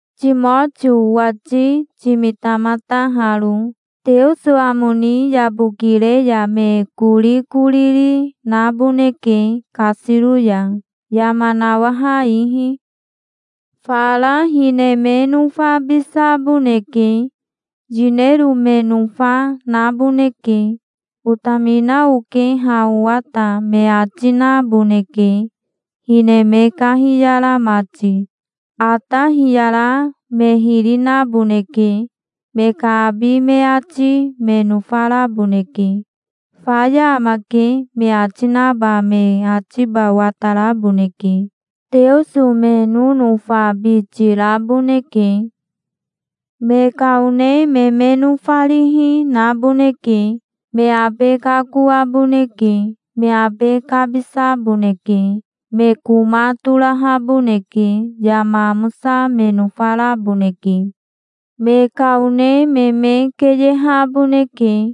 Timotio owati timitamata haro. Teoso amo ni yabokire ya me korikoriri naboneke kasiro ya, yama nawaha ihi. Fara hine me nofabisaboneke. Yinero me nofa, naboneke. "Otamina oke ha owa ta", me ati naboneke, hine me kahiyara mati. Ata hiyara me hiri naboneke. Me ka abi me ati me nofaraboneke. "Faya amake", me ati naba me atiba wataraboneke. Teoso me nonofabiti raboneke. Me ka one me me nofarihi, naboneke. Me abe kakoaboneke. Me abe kabisaboneke. Me koma torahaboneke. Yama amosa me nofaraboneke. Me ka one me me keyehaboneke.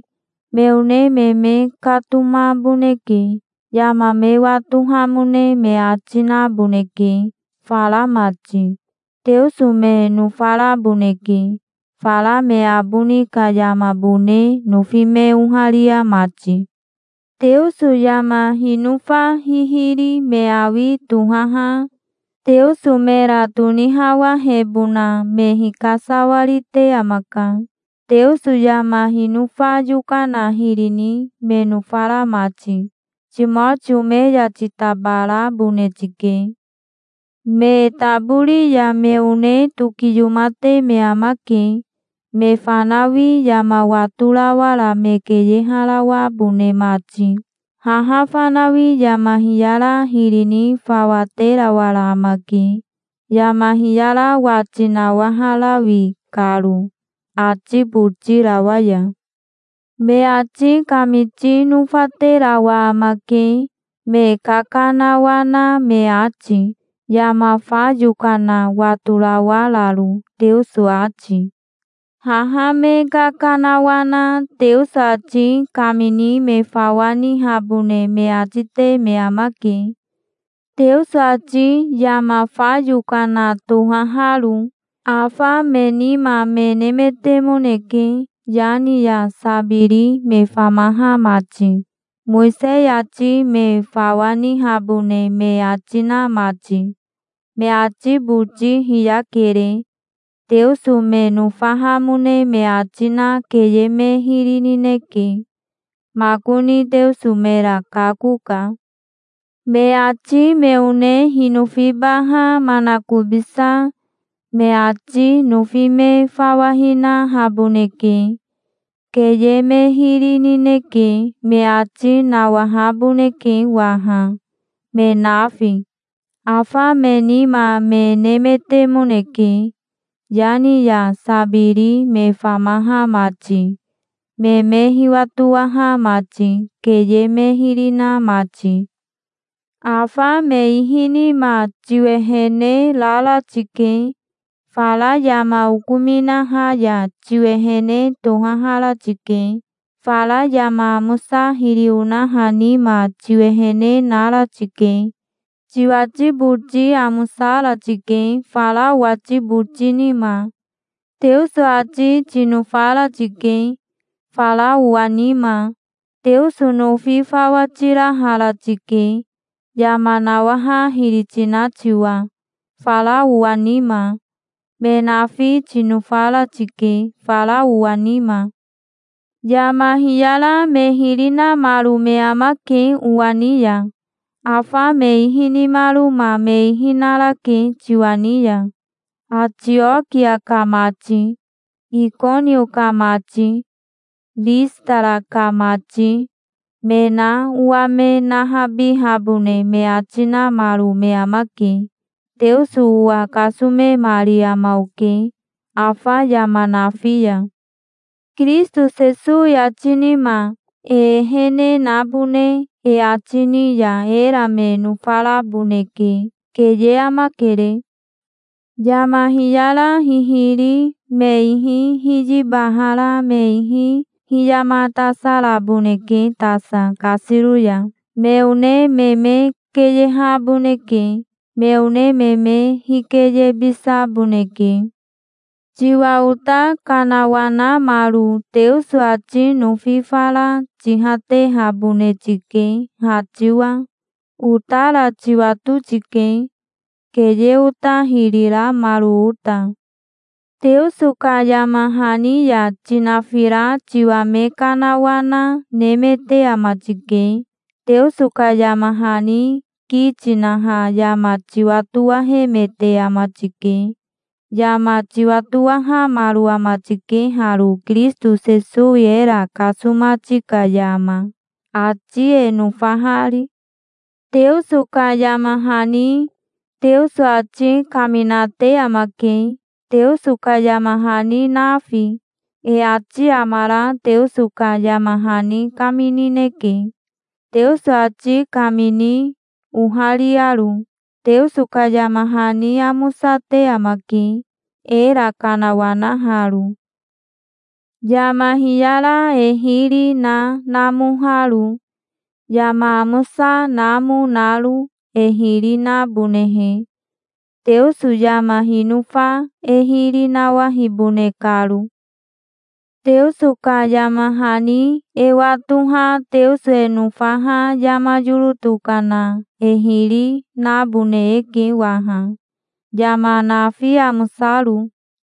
Me one me me katomaboneke. Yama me watohamone me ati naboneke, fara mati. Teoso me nofaraboneke, fara me aboni ka yamabone nofi me oharia mati. Teoso yama hinofa hihiri me awi tohaha Teoso mera tonihawahebona me hikasawarite amaka, Teoso yama hinofa yokana hiri ni me nofara mati. Timotio me ya titabarabone tike. Me tabori ya me one tokiyomate me amake, me fanawi yama watorawara me keyeharawabone mati. Haha fanawi yama hiyara hiri ni fawa terawara amake, yama hiyara wati nawaharawi karo, ati botirawa ya. Me ati kamiti nofaterawa amake, me kakanawana me ati, yama fa yokana watorawararo, Teoso ati. Haha me kakanawana Teoso ati kamini me fawa nihabone me ati te me amake, Teoso ati yama fa yokana tohaharo. Afa me nima me nemetemoneke Yani ya Sabiri me famaha mati, Mowisei ati me fawa nihabone me ati na mati. Me ati boti hiyakere. Teoso me nofahamone me ati na keye me hiri nineke. Makoni Teoso mera kakoka. Me ati me one hinofibaha manakobisa me ati nofi me fawa hinahaboneke. "Keye me hiri nineke", me ati nawahaboneke waha, me nafi. Afa me nima me nemetemoneke, Yani ya Sabiri me famaha mati, me me hiwatowaha mati, keye me hiri na mati. Afa me ihi nima tiwehene rara tike. Fara yama okominaha ya tiwehene tohahara tike. Fara yama amosa hiri onaha nima tiwehene nara tike. Tiwati boti amosara tike, fara owati boti nima. Teoso ati tinofara tike, fara owa nima. Teoso nofi fawa tirahara tike, yama nawaha hiri tina tiwa, fara owa nima. Me nafi tinofara tike, fara owa nima. Yama hiyara me hiri namaro me amake owa ni ya. Afa me ihi nimaroma me ihi narake tiwa ni ya. Atiokia ka mati, Ikonio ka mati, Ristara ka mati, me na owa me nahabihabone me ati namaro me amake. Teoso owa kasomemari ama oke afa yama nafi ya. Kirisito Sesowi ati nima e ehene nabone e ati ni ya era me nofaraboneke. Keye amakere. Yama hiyara hihiri me ihi hiyibahara me ihi hiyamatasaraboneke tasa kasiro ya. Me one me me keyehaboneke. Me one me me hikeyebisaboneke. Tiwa ota kanawanamaro Teoso ati nofi fara tihatehabone tike, ha tiwa. Otara tiwato tike, keye ota hiri ramaro ota. Teoso ka yama hani ya tinafira tiwa me kanawana nemete ama tike. Teoso ka yama hani ki tinaha yama tiwatowahemete ama tike. Yama tiwatowahamaro ama tike haro Kirisito Sesowi era kasomati ka yama, ati e nofahari. Teoso ka yama hani Teoso ati kaminate amake, Teoso ka yama hani nafi. E ati amara Teoso ka yama hani kaminineke, Teoso ati kamini ohariaro. Teoso ka yama hani amosate amake, era kanawanaharo, yama hiyara e hiri na namoharo, yama amosa namo naro, e hiri nabonehe, Teoso yama hinofa e hiri nawahibone karo. Teoso ka yama hani e watoha Teoso e nofaha yama yoro tokana e hiri nabone eke waha, yama nafi, amosaro.